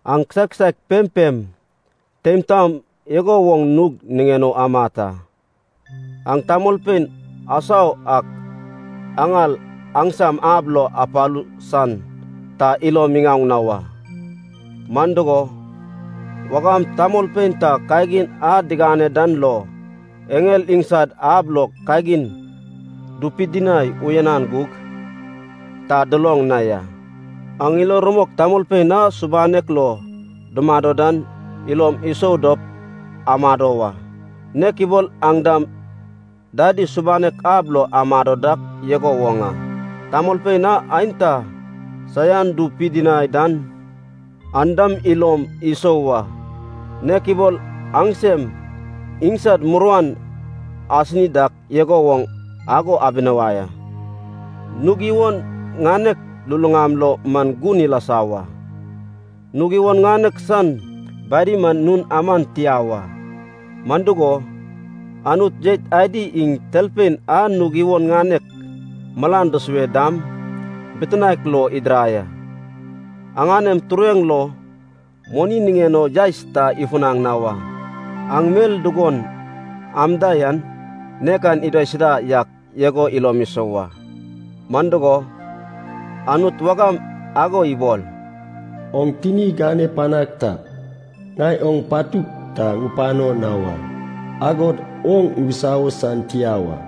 Aŋ kisaek kisaek pempem teim taom igo woŋ nug niŋen o amat a. Aŋ tamolpein asau ak aŋal aŋsam ab lo apalu san ta ilom iŋaoŋ na wa. Man dugo, wagam tamolpein ta kagin an digane dan lo eŋel iŋsad ab lo kagin dupidinai uyanan gug ta duloŋ na ya. Aŋ ilo rumok tamolpein a, subanek lo dumado dan ilom isou dop amado wa, nek ibol aŋ dam dadi subanek ab lo amado dak igo woŋ a. Tamolpein a aenta saian dupidinai dan, an dam ilom isou wa, nek ibol aŋsem iŋsad muruan asini dak igo woŋ ago abinawai a. Nug iwon ŋanek luluŋam lo man gun ilasa wa, nug iwon ŋanek san badim an nun aman tia wa. Man dugo, Anut jeit adi iŋ talpein a nug iwon ŋanek malan dusue dam bitinaek lo idirai a. Aŋanem tureŋ lo moni niŋen o yaes ta ifunaŋ na wa. Aŋ mel dugon am da yan, nek an idaisuda yak igo ilom isou wa. Man dugo, Anut wagam ago ibol, “Oŋ tini gane panag tap, ŋai oŋ patug ta ŋupano na wa, agod oŋ ŋibisawo san tia wa.”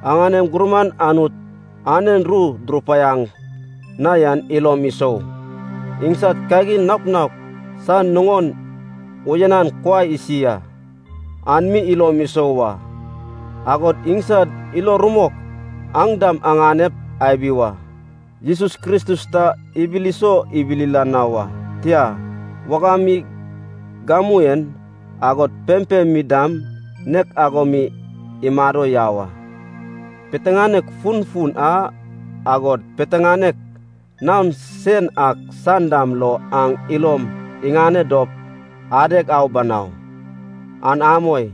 Aŋanem gurman Anut anen ru durupaiaŋ na yan ilom isou. Iŋsad kagin naok naok san nuŋon uyanan kuai isi a, an mi ilom isou wa. Agod iŋsad ilo rumok aŋ dam aŋanep abi wa. Jesus Kristus ta ibiliso ibilila na wa. Tia, wagam mi, gamu en, agod pempem mi dam nek ago mi imado yau a. Piteŋanek funfun a, agod piteŋanek naon sen ak san dam lo aŋ ilom iŋane dop adeg au banau, an amoi.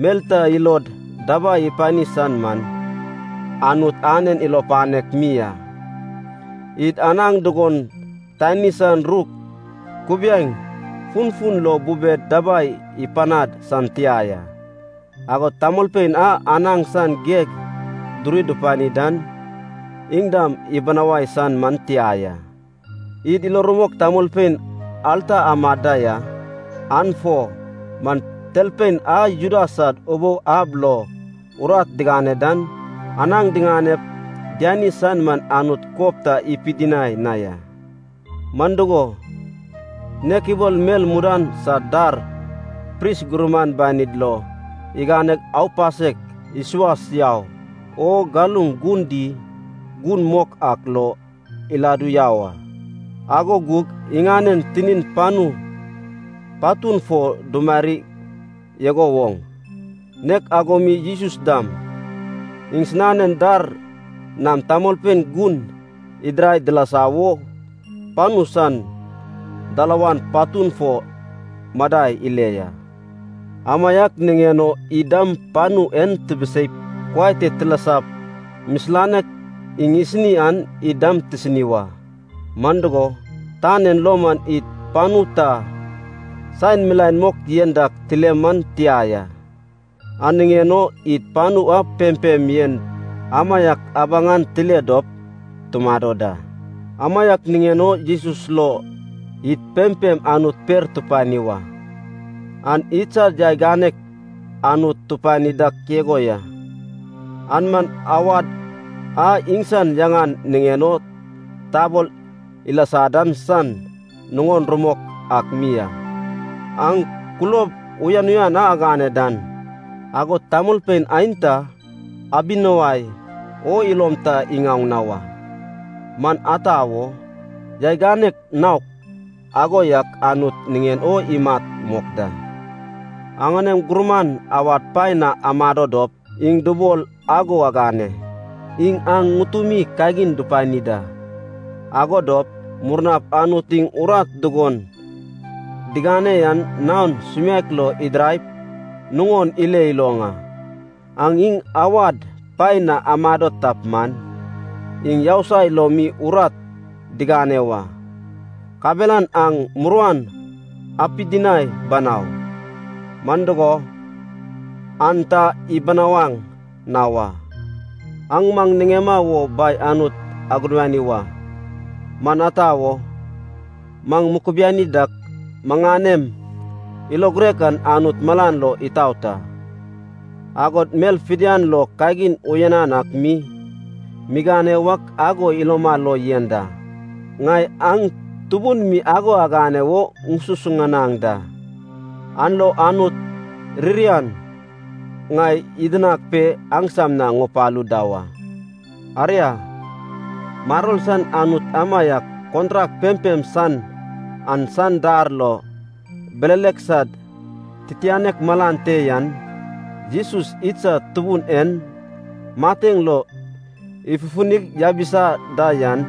Mel ta ilod dabai ipani san man Anut anen ilo panek mi a. Id anaŋ dugon tani san ru kubiaeŋ funfun lo bubed dabai ipanad san tia ya, agod tamolpein a anaŋ san geg duri dupani dan, iŋ dam ibinawai san man tia ya. Id ilo rumok tamolpein alta amad da ya, an fo man talpein a Juda sad ubou ab lo urat digane dan, anaŋ diŋanep diani san man Anut kob ta ipidinai na ya. Man dugo, nek ibol mel mudan san dar pris gurman banin lo iŋaneg aupasek isuas yau o galuŋ Gun Di, Gun Mok ak lo iladu yau a, ago gug iŋanen tinin panu patun fo dumari igo woŋ, nek ago mi Jesus dam, iŋsinanen dar nam tamolpein gun idirai dilasa wo panu san dalawan patun fo madai ile ya. Amaiak niŋen o id dam panu en tibiseip kuai te tilasap misilanek iŋ isini an id dam tisini wa. Man dugo, tan en lo man id panu ta saen milaen mok yen dak tile man tia ya, an niŋen o id panu a pempem yen amaiak abaŋ an tile dop tumado da. Amaiak niŋen o Jesus lo, id pempem Anut per tupani wa, an idsad yai ganek Anut tupani dak igo ya. An man awad a iŋsan yaŋan niŋen o tabol ilasa dan san nuŋon rumok ak mi a. Aŋ kulob uyan uyan a agane dan, agod tamolpein aenta abinawai o ilom ta iŋaoŋ na wa. Man ata wo, yai ganek naok ago yak Anut niŋen o imat mok da. Aŋanem gurman awad paen na amado dop iŋ dubol ago agane. Iŋ aŋ ŋutumi kagin dupani da, ago dop murnap Anut iŋ urat dugon digane an naon sumiaek lo idiraip nuŋon ile iloŋ a. Aŋ iŋ awad paen na amado tap man, iŋ yousai lo mi urat digane wa. Kabelan aŋ muruan apidinai banau, man dugo, an ta ibinawaŋ na wa. Aŋ maŋ niŋema wo Bai Anut agudani wa. Man ata wo, maŋ mukubiani dak maŋanem ilo girek an Anut malan lo itaot a, agod mel fidian lo kagin uyanan ak mi migane wak ago iloma lo yen da. Ŋai aŋ tubun mi ago agane wo ŋususuŋanaŋ da, an lo Anut ririan ŋai idinag pe aŋsam na ŋupalu da wa. Aria, maror san Anut amaiak, kontrak pempem san an san dar lo, bilelek sad titianek malan te yan, Jesus idsad Tubun en, mateŋ lo ifufunig yabisa da yan,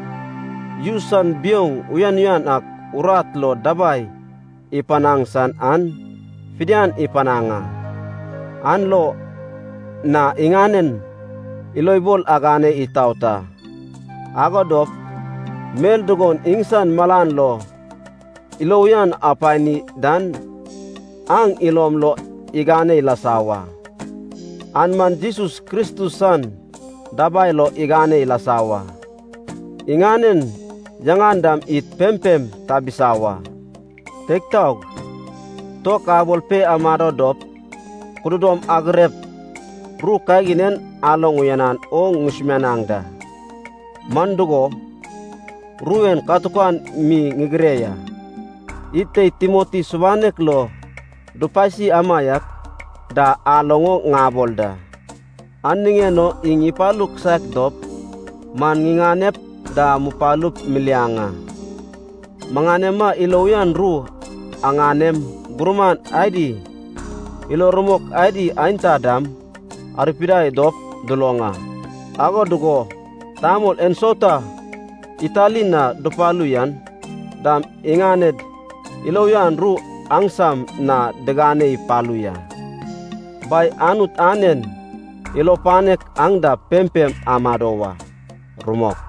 yu san biouŋ uyan uyan ak urat lo dabai ipanaŋ san an fidian ipanaŋ a, an lo na iŋanen ilobol agane itaot a. Ago dop mel dugon iŋsan malan lo ilo uyan ipani dan aŋ ilom lo igane ilasa wa. An man Jesus Kristus san dabai lo igane ilasa wa, iŋanen yaŋan dam id pempem tabisa wa. Teig taog, tok abol pe amado dop kududom agurep ru kagin en aloŋ uyan o ŋusumianaŋ da, man dugo, ru en katukan mi ŋigire ya. Id teid Timoti subanek lo dupasi amaiak da aloŋ o ŋabol da. An niŋen o iŋ ipalu kisaek dop man ŋiŋanep da mupalup miliaŋ a. Maŋanema ilo uyan ru aŋanem gurman adi, ilo rumok adi aenta dam arupidai dop duloŋ a. Ago dugo tamol ensauta Itali na dupalu yan, dam iŋaned ilo uyan ru aŋsam na digane ipalu ya. Bai Anut anen ilo panek aŋ da pempem amado wa. Rumok.